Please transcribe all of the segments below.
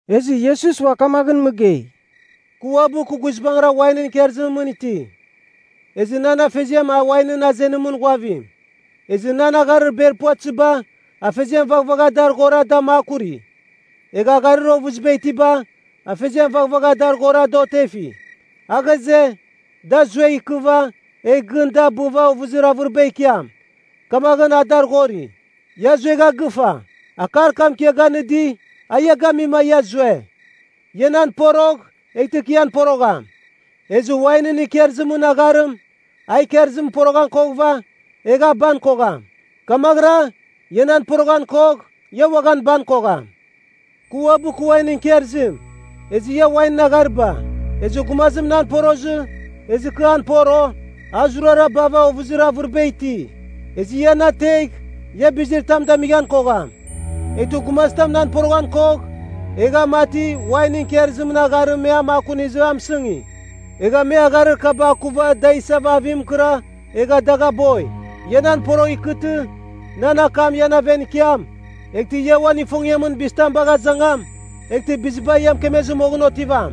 Ezɨ Iesus ua kamaghɨn mɨgei, “Kɨ uabɨ kɨ guizbangɨra wainɨn ikarzimɨn mɨn iti. Ezɨ nan Afeziam a wainɨn azenimɨn ghuavim. Ezɨ nan agharir ber puvatɨziba, Afeziam vaghavagha dar ghora da makuri. Egha agharir ovɨziba itiba, Afeziam vaghavagha a dar ghora da otefi. A ghaze, da zuegh ikɨva, egh gɨn da bɨva ovɨzir avɨriba ikiam, kamaghɨn a dar ghori. Ia zuegha gɨfa. Akar kam kɨ ia ganɨdi, a ia gamima ia zue. Ia nan porogh, eghtɨ kɨ ian porogham. Ezɨ wainɨn ikarzimɨn agharim, a ikarzimɨn poroghan koghɨva, egh a ban kogham. Kamaghɨra, ia nan poroghan kogh, ia uaghan ban kogham. “Kɨ uabɨ kɨ wainɨn ikarzim, ezɨ ia wainɨn aghariba. Ezɨ gumazim nan porozɨ, ezɨ kɨ an poro, a zurara bava ovɨzir avɨriba iti. Ezɨ ia na ategh, ia bizir tam damighan kogham. Eghtɨ gumazitam nan poroghan kogh, egh a mati wainɨn ikarzimɨn agharim me a makunizɨ a mɨsɨngi. Egha me agharir kaba akuva da isava avim mɨkɨra egha dagh aboi. “Ia nan porogh ikɨtɨ, nan akam ian aven ikiam, eghtɨ ia uan ifongiamɨn bizitam bagh azangam, eghtɨ biziba ia mɨkemezɨ moghɨn otivam.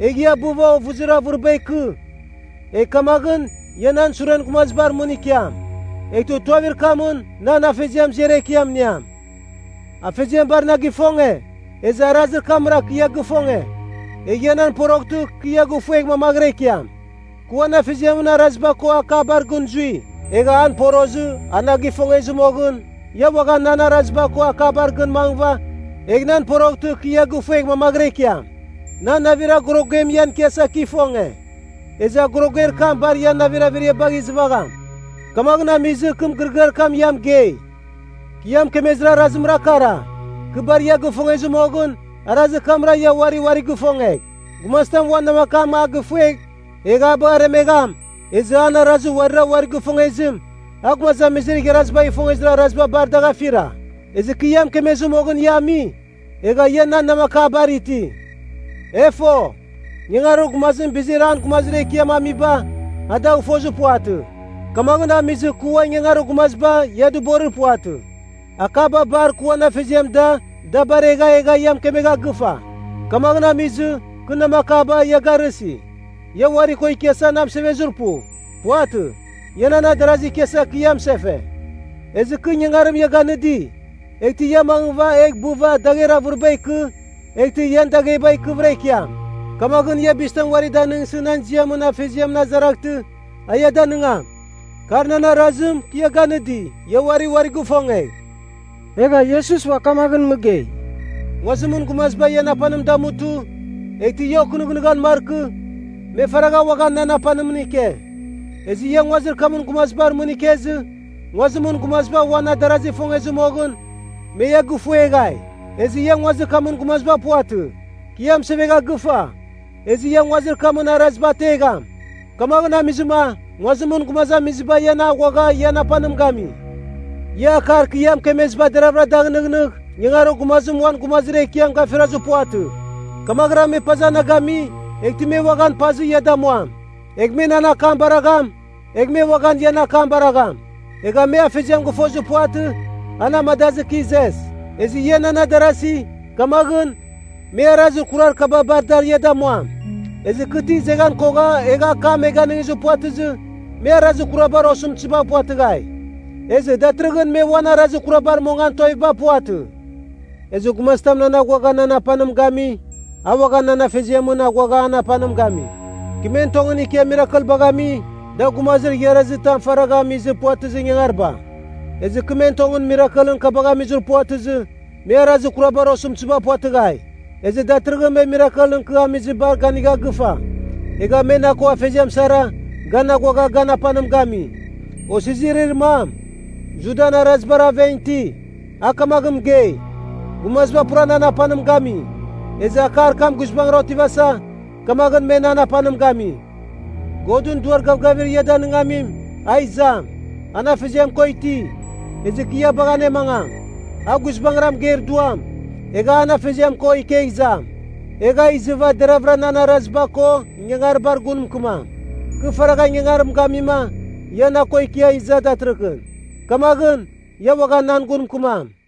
Egh ia bɨva ovɨzir avɨriba ikɨ, egh kamaghɨn ia nan suren gumazibar mɨn ikiam. Eghtɨ tuavir kamɨn nan Afeziam ziar ekiam iniam. “Afeziam bar na gifonge, ezɨ arazir kamra kɨ ia gifonge. Egh ia nan poroghtɨ kɨ ia gifuegh mamaghɨra ikiam. Kɨ uan Afeziamɨn araziba ko akabar gɨn zui, egha an porozɨ a na gifongezɨ moghɨn, ia uaghan nan araziba ko akabar gɨn mangɨva egh nan poroghtɨ kɨ ia gifuegh mamaghɨra ikiam. “Nan navir agorogem ian ikiasa kɨ ifonge. Ezɨ agoroger kam bar ian navir averiabagh izɨvagham. Kamaghɨn amizɨ kɨ mɨgɨrɨgɨar kam ia mɨgei. Kɨ ia mɨkemezir arazimra kara: kɨ bar ia gifongezɨ moghɨn, arazir kamra ia uari uarigh ifongegh. Gumazitam uan namakam a gifuegh egh a bagh aremegham, ezɨ an arazir uarira uari ifongezim, a gumazamizir igharazibagh ifongezir araziba bar dagh afira. Ezɨ kɨ ia mɨkemezɨ moghɨn ia ami, egha ia nan namakabar iti. E fo, ingangarir gumazim bizir an gumazir ekiam amiba, a dagh fozir puvatɨ. Kamaghɨn amizɨ kɨ ua ‘ingangarir gumaziba’ ia dɨborir puvatɨ. Akaba bar kɨ uan Afeziam da, da baregha egha kɨ ia mɨkemegha gɨfa. Kamaghɨn amizɨ, kɨ ‘namakaba’ ia garɨsi. “Ia uari ko ikiasa na mɨsevezir pu. Puvatɨ. Ia nan adarazir ikiasa kɨ ia mɨsefe. Ezɨ kɨ ingangarim ia ganɨdi, eghtɨ ia mangɨva egh bɨva dagher avɨriba ikɨ, eghtɨ ian dagheba ikɨvɨra ikiam. Kamaghɨn ia bizitam uari danɨngsɨ nan ziamɨn Afeziamɨn azaraghtɨ, a ia danɨngam. Kar nan arazim, kɨ ia ganɨdi: Ia uari uarigh ifongegh.” Egha Iesus ua kamaghɨn mɨgei, “Nguazimɨn gumaziba ian apanim damutɨ, eghtɨ ia okɨnɨghnɨghan markɨ, me faragha uaghan nan apanimɨn ike. Ezɨ ia nguazir kamɨn gumazibar mɨn ikezɨ, nguazimɨn gumaziba uan adarazigh ifongezɨ moghɨn, me ia gifueghai. Ezɨ ia nguazir kamɨn gumaziba puvatɨ. Kɨ ia mɨsevegha gɨfa, ezɨ ia nguazir kamɨn araziba ategham. Kamaghɨn amizɨma nguazimɨn gumazamiziba ian aghuagha ian apanim gami. Ia akar kɨ ia mɨkemeziba deraghvɨra da gɨnɨghnɨgh, ingangarir gumazim uan gumazir ekiam gafirazir puvatɨ. Kamaghɨra me paza na gami, eghtɨ me uaghan pazɨ ia damuam. Egh me na akam baragham, egh me uaghan ian akam baragham. Egha me Afeziam gɨfozir puvatɨ, a na amadazɨ kɨ izes. Ezɨ ia nan adarasi, kamaghɨn, me arazir kurar kaba bar dar ia damuam. Ezɨ kɨ ti izeghan kogha egha akam me ganizir puvatɨzɨ, me arazir kurabar osɨmtɨziba puvatɨghai. Ezɨ datɨrɨghɨn me uan arazir kurabar mongan tuaviba puvatɨ. Ezɨ gumazitam nan aghuagha nan apanim gami, a uaghan nan Afeziamɨn aghuagha an apanim gami. Kɨ men tongɨn ikia mirakelbagh ami, da gumazir igharazi tam faragha amizir puvatɨzir ingangariba. Ezɨ kɨ men tongɨn mirakelɨn kabagh amizir puvatɨzɨ, me arazir kurabar osɨmtɨziba puvatɨghai. Ezɨ datɨrɨghɨn me mirakelɨn kɨ amizibar ganigha gɨfa, egha me na ko Afeziam sara, gan aghuagha gan apanim gami. Osizirir mam, Judan Arazibar aven iti, a kamaghɨn mɨgei, ‘Gumaziba pura nan apanim gami.’ Ezɨ akar kam guizbangɨra otivasa, kamaghɨn me nan apanim gami. “Godɨn Duar Gavgavim ia Danɨngamim, a izam. An Afeziam ko iti, ezɨ kɨ ia bagh anemangam. A guizbangɨra mɨgeir Duam, egha an Afeziam ko ikegh izam. Egh a izɨva deravɨra nan araziba ko ingangaribar gun mɨkɨmam. Kɨ faragh ingangarim gamima, ia na ko ikia iza datɨrɨghɨn. Kamaghɨn, ia uaghan nan gun mɨkɨmam.